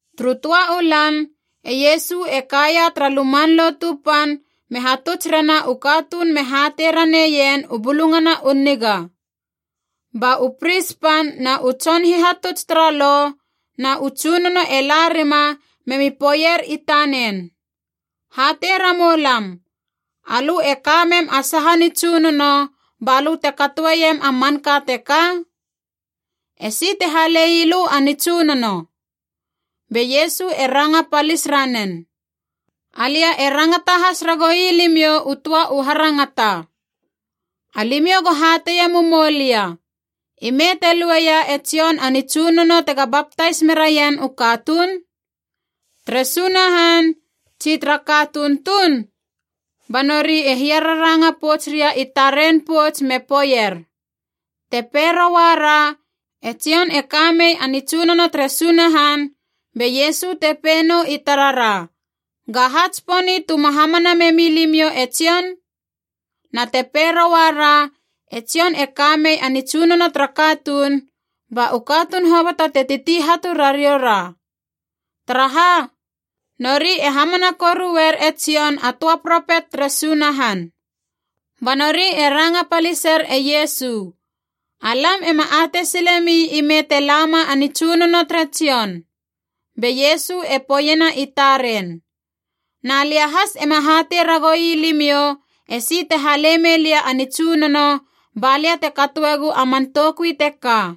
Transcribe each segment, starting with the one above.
Turu töa u lan, e Iesu e kaia tara Luman Lotu Pan me hatuts rena u katuun me hatei raneien u Bulungana u Niga. Ba u pris pan na u tson hihatuts tara Lo na u tsunono e la rima me mi poeier i tanen, “Hatei ramou lam, alö e ka mem a saha nitsunono ba lö te katoeiem a manka teka? Esi te hale ii lö a nitsunono?” Be Iesu e ranga palis ranen, “Alia e rangata has ragoui limiou u töa u harangata. Alimiou go hateie mumou lia, ime te lueia e Jon a nitsunono tega baptais meraien u katuun? Tere Sunahan, tsi tara katuun tuun?” Ba nori e hiararanga pouts ria i taren pouts me poeier, “Te pei rouara, ‘E Jon e ka mei a nitsunono tere Sunahan,’ be Iesu te pei nou i tarara, ‘Ga ha tsiponi tu ma hamana memi limiou e Jon?’ Na te pei rouara, ‘E Jon e ka mei a nitsunono tara katuun,’ ba u katuun hoboto te titi hatu rariou ra. Taraha? Nori e hamana koruer e Jon a töa propet tere Sunahan.” Ba nori e ranga paliser e Iesu, “Alam ema atei silemi ime te lama a nitsunono tere Jon.” Be Iesu e poeiena i taren, “Na lia has ema hatei ragou ii limiou esi te hale mei lia a nitsunono balia te katoegu a man toukui teka.”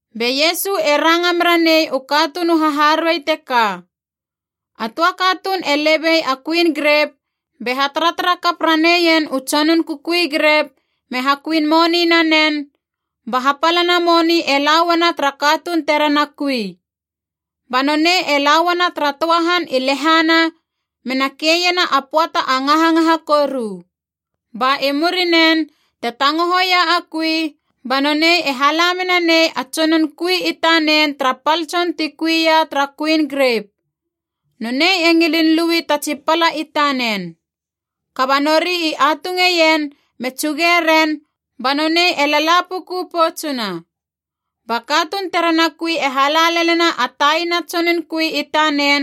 Be Iesu e ranga mera nei u katuun u haharuei teka, “A töa katuun e lebei a kuin grep, be hataratara kap raneien u tsonun kukui grep me hakuin moni nanen, ba hapalana moni e la uana tara katuun terena kui. Ba nonei e la uana tara töa han i lehana mena keiena a pöata a ngahangaha koru. Ba i murinen, te tangohoia a kui, ba nonei e hala mena nei a tsonun kui i tanen tara pal tson ti kui ia tara kuin grep. Nonei e ngilin lui ta tsi pala i tanen. Kaba nori i atungeien me tsuge ren ba nonei e lala puku poutsuna. Ba katuun terena kui e hala lelena a taina tson kui i tanen,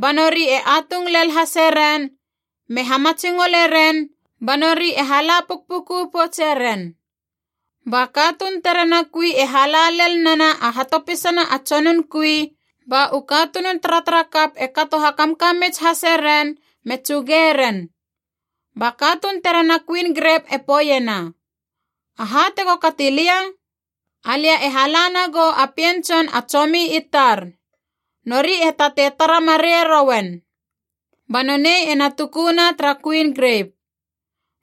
ba nori e atung lel hase ren, me hamatsingole ren, ba nori e hala pukpuku poutse ren. Ba katuun terena kui e hala lel nena a hatopisana a tsonun kui, ba u katunun taratarakap e kato hakamkamits hase ren me tsuge ren. “Ba katuun terena kuin grep e poeiena, ‘Aha tego kati lia? Alia e hala nagou a pien tson a tsomi i tar. Nori e tatei tara mareie rouen.’ Ba nonei ena tukuna tara kuin grep.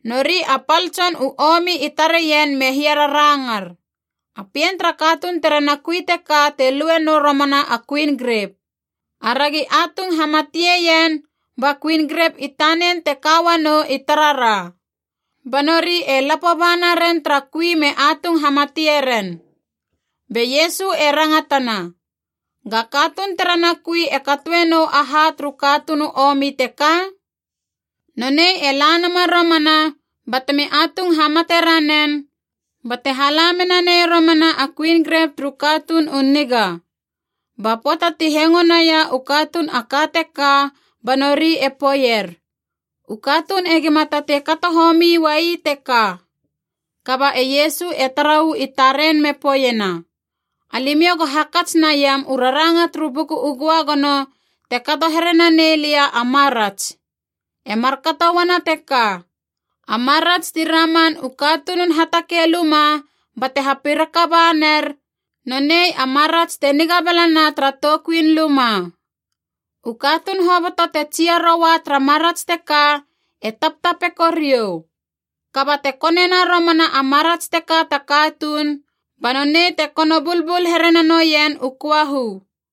Nori a pal tson u omi i tareien me hiararangar, ‘A pien tara katuun terena kui teka te lue nou romana a kuin grep. Aragi atung hamatieien, ba kuin grep i tanen te ka uanou i tarara!’ Ba nori e lapo ba naren tara kui me atung hamatie ren.” Be Iesu e rangatana, “Ga katuun terena kui e katoe nou aha turu katuun u omi teka? Nonei e la nama romana batemi atung hamate ranen, bate hala mena nei romana a kuin grep turu katuun u niga.” Ba pöata ti hengo naia u katuun a ka teka ba nori e poeier, “U katuun egima tatei kato homi uai teka!” Kaba e Iesu e tara uu i taren me poeiena, “Alimiou go hakats naiam u raranga turu Buku Göagono te kato here nanei lia a marats. E markato uana teka: ‘A marats ti raman u katunun hatakei luma bate hapiraka ba ner, nonei a marats te niga balana tara toukuin luma.’ “U katuun hoboto te tsia roua tara marats teka e taptapeko riou. Kaba te konena romana a marats teka ta katuun, ba nonei te kono bulbul here nanoien u köahu!”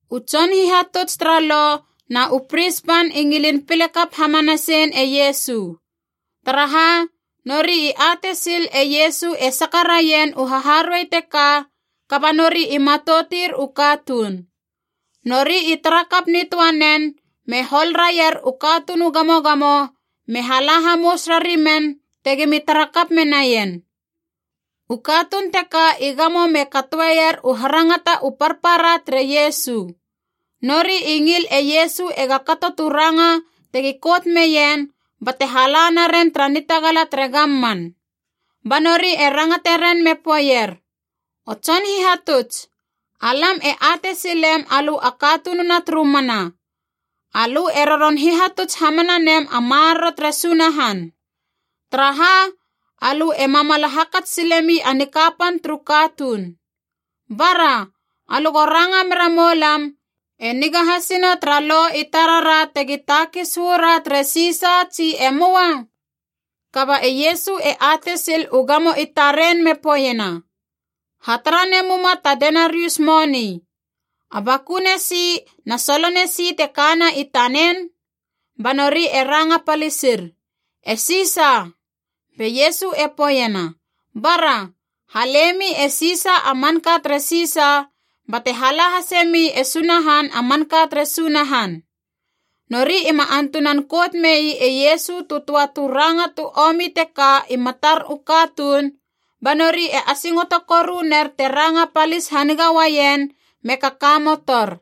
U tson hihatuts tara Lo na u pris pan i ngilin pile kap hamanasein e Iesu. Taraha? Nori i atei sil e Iesu e saka raien u haharuei teka, kaba nori i matoutir u katuun. Nori i tara kap nitöa nen me hol raier u katuun u gamogamo me hala hamous rari men tegimi tara kap menaien. U katuun teka i gamo me katoeier u harangata u parpara tere Iesu. Nori i ngil e Iesu ega kato tu ranga tegi kout meien bate hala naren tara nitagala tere gamman. Ba nori e rangate ren me poeier, “O Tson Hihatuts, alam e atei silem alö a katununa turu mana. Alö e roron hihatuts hamana nem a maroro tere Sunahan. Taraha? Alö e mamala hakats silemi a nikapan turu katuun. Bara, alö go ranga mera moulam, e niga hasina tara Lo i tarara tegi takis uu ra tere Sisa, tsi e möa?” Kaba e Iesu e atei sil u gamo i taren me poeiena, “Hatara nemuma ta denarius moni. A bakune si na solone si te kana i tanen?” Ba nori e ranga palisir, “E Sisa.” Be Iesu e poeiena, “Bara, halemi e Sisa a manka tere Sisa, bate hala hasemi e Sunahan a manka tere Sunahan!” Nori ima antunan kout mei e Iesu tu töa tu ranga tu omi teka i matar u katuun, ba nori e asingoto koru ner te ranga palis haniga uaien me kakamotor.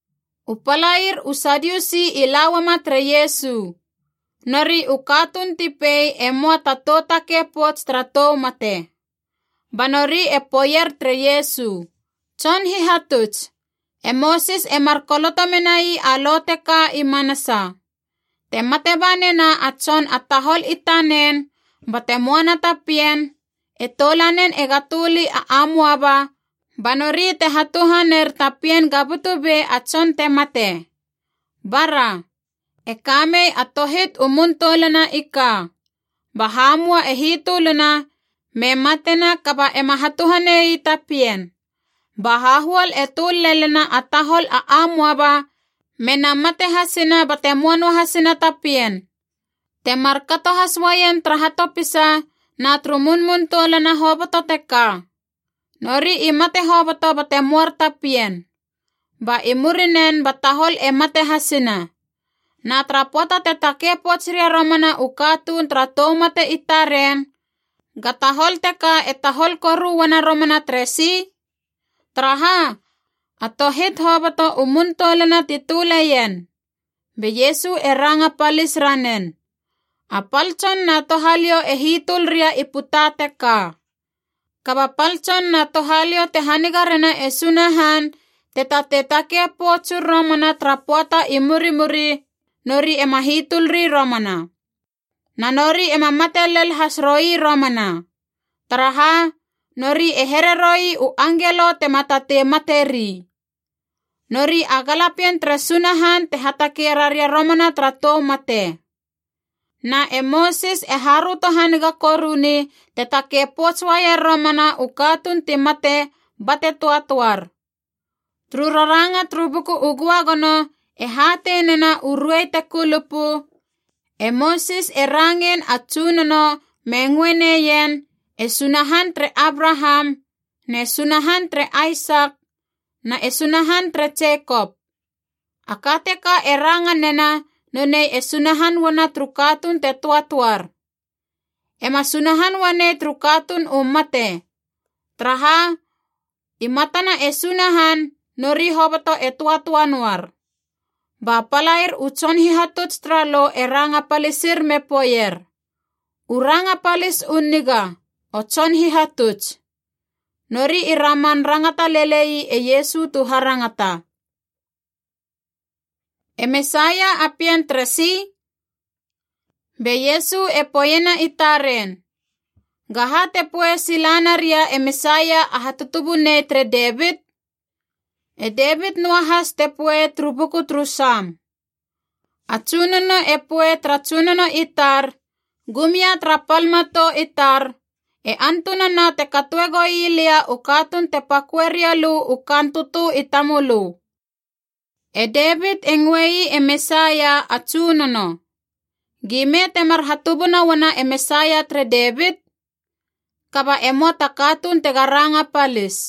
U palair u Sadiusi i la uama tere Iesu. Nori u katuun ti pei e möa ta tou takei pouts tara tou mate. Ba nori e poeier tere Iesu, “Tson Hihatuts, e Mosis e mar koloto menai a Lo teka i manasa: ‘Te mate ba nena a tson a tahol i tanen bate möana ta pien, e toulanen ega töli a amoaba ba nori te hatuhaner ta pien ga butu be a tson te mate.’ Bara. E kamei a tohit u mun toulana i ka. Ba hamua e hitöluna, me matena kaba ema hatuhane ii ta pien. Ba hahuol e töl lelena a tahol a amoaba mena mate hasina bate möa noahasina ta pien. Te mar kato has uaien tara hatopisa na turu munmun toulana hoboto teka. Nori i mate hoboto bate möar ta pien. Ba i murinen ba tahol e mate hasina. Na tara pöata te takei pouts ria romana u katuun tara tou mate i taren, ga tahol teka e tahol koru uana romana teresi? Taraha? A tohit hoboto u muntoulana ti töleien!” Be Iesu e ranga palis ranen, “A pal tson na touhaliou e hitöl ria i puta teka. Kaba pal tson na touhaliou te haniga rena e Sunahan te tatei takei poutsur romana tara pöata i murimuri, nori ema hitölri romana. Na nori ema mate lel has roui romana. Taraha? Nori e here roui u angelo tema tatei materi. Nori a galapien tere Sunahan te hatakei raria romana tara tou mate. Na e Mosis e haröto haniga koruni te takei pouts uaier romana u katuun ti mate bate töatöar. Turu raranga turu Buku u Göagono e hatei nena u ruei te kulupu, e Mosis e rangein a Tsunono me ngöe neien, ‘E Sunahan tere Abraham, ne Sunahan tere Aisak, na e Sunahan tere Jekop.’ A ka teka e ranga nena nonei e Sunahan uana turu katuun te töatöar. E ma Sunahan uanei turu katuun u mate. Taraha? I matana e Sunahan, nori hoboto e töatöa noar.” Ba palair u tson hihatuts tara Lo e ranga palisir me poeier, “U ranga palis u niga, o Tson Hihatuts!” Nori i raman rangata lele ii e Iesu tu harangata. E Mesaia a pien teresi? Be Iesu e poeiena i taren, “Gaha te poei sila naria e Mesaia a hatutubunei tere Devit? E Devit noa has te poei turu buku turu Sam: ‘A Tsunono e poei tara Tsunono i tar, Gum ia tara pal matou i tar, e antunana te katoe goii lia u katuun te paköe riou lö u kaan tötö i tamölö.’ “E Devit e ngöe ii e Mesaia ‘A Tsunono.’ Gime temar hatubuna uana e Mesaia tere Devit?” Kaba e möa ta katuun tega ranga palis.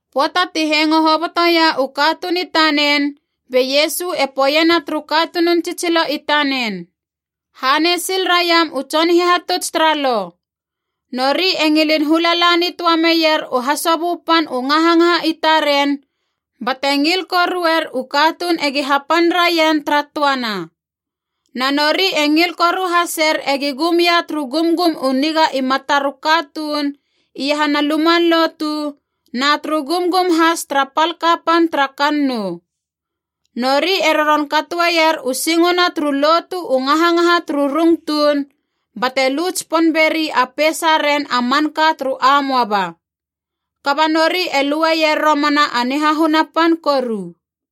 Pöata ti hengo hobotoia u katuun i tanen, be Iesu e poeiena turu katunun tsitsilo i tanen, “Hanei sil raiam u tson hihatuts tara Lo. Nori e ngilin hula la nitöa meier u hasobö pan u ngahangaha i taren, bate ngil koruer u katuun egi hapan raien tara töana. Na nori e ngil koru haser egi gum ia turu gumgum u niga i matar u katuun iahana luman lotu na turu gumgum has tara pal kapan tara kannou. Nori e roron katoeier u singona turu lotu u ngahangaha turu rung tuun, bate lu tsipon beri a peisaren a manka turu amoaba. Kaba nori e lueier romana a nihahuna pan koru.”